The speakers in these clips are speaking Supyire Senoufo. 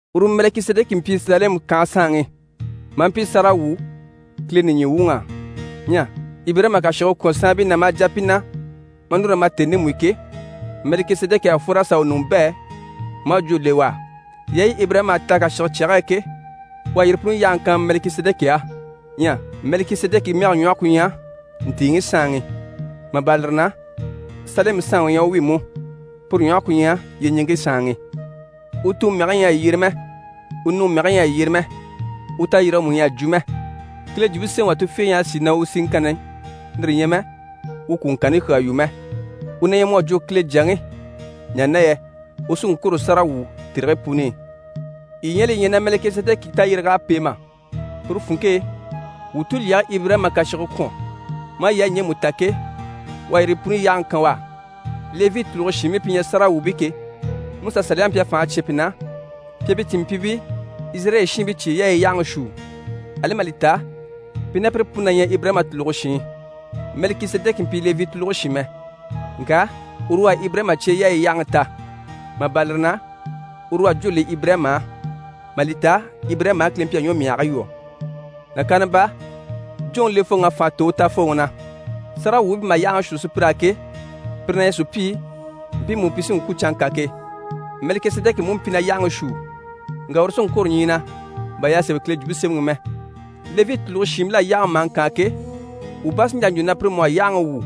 Uru Mɛlikisedɛki mpyi Salɛmu kànhe saanŋi, maa mpyi sáragawwu Kileŋi nìɲyi wuŋ'á. Ɲyɛ Ibirayima à kàshige kwɔ̀n saanbii na maa jà pi na, maa núru na ma tèni ndemu i ke, Mɛlikisedɛki à fwor'a sà u ɲùŋɔ bɛ̂, maa jwó le u á. Yaayi Ibirayima à ta kàshige e ke, u à yire puni yáhaŋi kan Mɛlikisedɛki á. Ɲyɛ Mɛlikisedɛki mɛge ɲwɔhe ku ɲyɛ: «ntìiŋi saanŋi». Mà bâra lire na, Salɛmu saanŋi u ɲyɛ u wi, puru ɲwɔhe ku ɲyɛ: «yyeɲiŋke saanŋi». U tuŋi mɛge ɲyɛ a yyere mɛ, u nuŋi mɛge ɲyɛ a yyere mɛ, u tayirige mú ɲyɛ a jwo mɛ, Kile Jwumpe Semɛŋi wà tufiige ɲyɛ a sìi na u siŋkanni, lire ɲyɛ mɛ na u kwùŋkanni kyaa yu mɛ. U na ɲyɛ mu à jwo Kile Jyaŋi, ɲaha na yɛ u sí n‑kwôro sáragawwu tèrigii puni i. Yii ɲyɛ a li ɲya na Mɛlikisedɛki tayyéreg'à pêe mà? Puru funŋke e, wuu tulyɛge Ibirayima à kàshige kwɔ̀n mà yaayi ɲjemu ta ke, u à yire puni yáhaŋi kan u á. Levi tùluge shiinbii pi ɲyɛ sáragawwuubii ke, MusaSaliyaŋi mpyi a fànhe cyán pi na pi à pi cìnmpyiibii Izirayɛli shiinbii cyeyaayi yáhaŋi shuu, ali mà li ta pi ná pire puni na ɲyɛ Ibirayima tùluge shiin. Mɛlikisedɛki mpyi Levi tùluge shin mɛ, ŋka uru u à Ibirayima cyeyaayi yáhaŋi ta. Mà bâra lire na, uru u à jwó le Ibirayima á, mà li ta Ibirayima á Kile mpyi a ɲwɔmyahigii lwɔ́. Nàkaana baa, jwóŋi lefooŋ'à fànha tò u tafooŋi na. Sáragawwuubii pi maha yáhaŋi shuu sùpyir'á ke, pire na ɲyɛ sùpyii mpiimu pi sí n‑kwû canŋka ke. Mɛlikisedɛki mú mpyi na yáhaŋi shuu, ŋka uru sí n‑kwôro ɲyii na bà y'à sémɛ Kile Jwumpe Semɛŋi i mɛ. Levi tùluge shiinbil'á yáhaŋi maha ŋkaan ke, wuu bá sí n‑jà n‑jwo na pire mú à yáhaŋi wwû,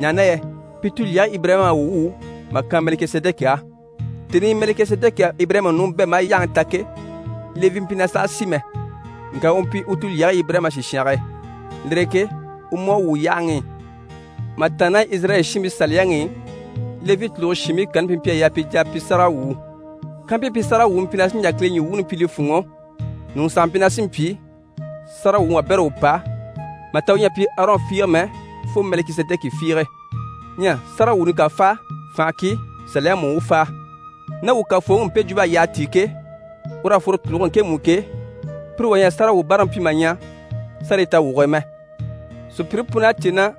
ɲaha na yɛ pi tulyɛge Ibirayima à u wwû mà kan Mɛlikisedɛki á. Tèni i Mɛlikisedɛki à Ibirayima ɲùŋɔ bɛ̂ maa yáhaŋi ta ke, Levi mpyi na sàha si mɛ, ŋka u mpyi u tulyɛge Ibirayima sìshange e, lire e ke u mú à wwû yáhaŋi i. Ma tàanna ná Izirayɛli shiinbii Saliyaŋi i, Levi tùluge shiinbii kanni pi mpyi a yaa pi jà a pyi sáragawwuu. Kampyi pi sáragawwuuni mpyi na sí n‑jà Kile ɲyii wuuni pyi li fûnŋɔ, ɲùŋɔ sàha mpyi na sì n‑pyi sáragawwuŋi wabɛrɛ u pa mà ta u ɲyɛ a pyi Arɔn fiige mɛ, fo Mɛlikisedɛki fiige. Ɲyɛ sáragawwuuni ká fáa, fànha ki Saliyaŋi mú u fáa. Ná wuu Kafooŋi i, mpe jwump'à yyaha tíi ke, ur'à fworo tùluge ŋkemu i ke, pire wà ɲyɛ a sáragawwubaaraŋi pyi mà ɲya sárayi tawwuge e mɛ. Sùpyire pun'à cè na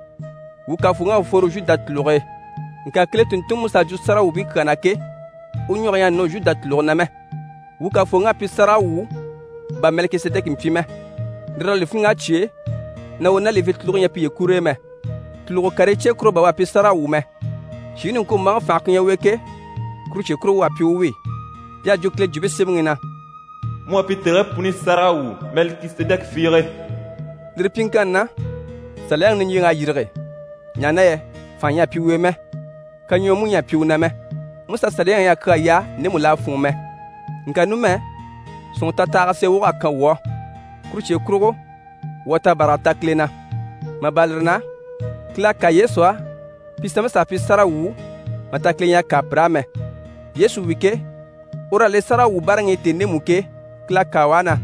wuu Kafooŋi à fworo Zhuda tùluge e, ŋka Kile tùnntunŋi Musa à jwo sáragawwuubii kyaa na ke, u ɲwɔge ɲyɛ a nɔ Zhuda tùluge na mɛ. Wuu Kafooŋi à pyi sáragawwu bà Mɛlikisedɛki mpyi mɛ, lire l'à li fíniŋ'a cyêe na u ná Levi tùluge ɲyɛ piye kur'e mɛ. Tùlugo karii cye kurugo bà u à pyi sáragawwu mɛ, shìŋi niŋkwombaaŋi fànhe ku ɲyɛ u e ke, kuru cye kurugo u à pyi u wi. Y'à jwo Kile Jwumpe Semɛŋi i na: «Mu à pyi tèrigii puni sáragawwu Mɛlikisedɛki fiige.» Lire pyiŋkanni na, Saliyaŋi niɲjyeŋ'à yîrige, ɲaha na yɛ fànha ɲyɛ a mpyi u e mɛ, kaɲwɔɔ mú ɲyɛ a mpyi u na mɛ. Musa Saliyaŋi ɲyɛ a kyaa yaa ndemu l'à fûnŋɔ mɛ, ŋka numɛ sɔ̀nŋɔrɔ tatahaga sèe wog'à kan wuu á. Kuru cye kurugo, wuu à tabaraga ta Kile na. Mà bâra lire na, Kile à kâa Yesu á, pi sanmpii s'à pyi sáragawwuu mà ta Kile ɲyɛ a kâa pir'á mɛ. Yesu wi ke, ur'à le sáragawwubaaraŋi i tèni ndemu i ke, Kile à kâa u á na: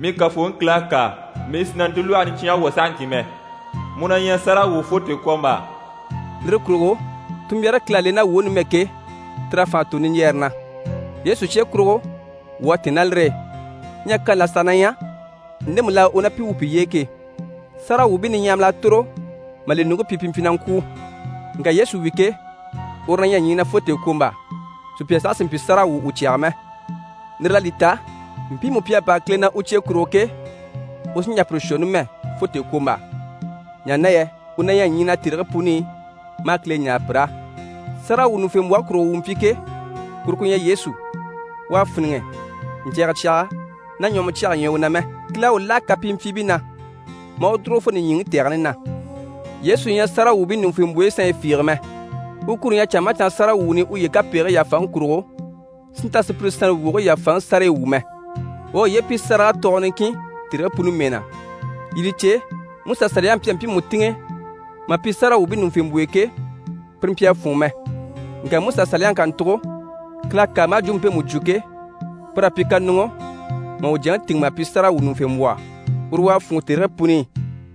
«Mii Kafooŋi Kile à kâa, mii sì na ntilwɔhe niɲcyange lwɔ́ sahaŋki mɛ: “mu na ɲyɛ sáragawwu fo tèekwombaa.”» Lire kurugo tunmbyaare Kile à le ná wuu e numɛ ke, tir'à fànha tò niɲjyɛɛre na. Yesu cye kurugo, wuu à tɛ̀ɛn ná lire e. Ɲyɛ kani là saha na ɲyɛ, ndemu l'à u ná pi wwû piye e ke. Sáragawwuubii niɲyahamil'à tòro mà li ɲùŋke pyi, pi mpyi na ŋkwûu. Ŋka Yesu wi ke, uru na ɲyɛ ɲyii na fo tèekwombaa, sùpya saha sì n‑pyi sáragawwu u cyaga mɛ. Lire l'à li ta, mpiimu pi à bâra Kile na u cye kurugo ke, u sí n‑jà pire shwɔ numɛ fo tèekwombaa, ɲaha na yɛ u na ɲyɛ ɲyii na tèrigii puni i, maa Kile ɲáare pir'á. Sáragawwuɲuŋufembwɔhe kurugo wuu mpyi ke, kuru ku ɲyɛ Yesu. U à fíniŋɛ, ɲcɛ̀ɛgɛ cyaga ná ɲwɔhɔmɔ cyaga ɲyɛ u na mɛ. Kile à u láha kapimpyiibii na, maa u dùrugo fo nìɲyiŋi tɛgɛni na. Yesu ɲyɛ sáragawwuubii ɲùŋufembwoyi sanɲyi fiige mɛ, u kuro ɲyɛ canŋa maha canŋa sáragawwuuni i uye kapegigii yàfaŋi kurugo si nta sùpyire sannte wogigii yàfaŋi sárayi wwû mɛ. U à uye pyi sáraga tɔɔgɔ niŋkin tèrigii puni mɛɛ na. Yii li cè, Musa Saliyaŋi mpyi a mpiimu tìŋɛ mà pyi sáragawwuubii ɲùŋufembwoyo ke, pire mpyi a fûnŋɔ mɛ. Ŋka Musa Saliyaŋi kàntugo, Kile à kâa maa jwumpe mpemu jwo ke, pur'à pyi kaɲuŋɔ mà u Jyaŋi tìŋɛ mà pyi sáragawwuɲuŋufembwɔhɔ, uru u à fûnŋɔ tèrigii puni i.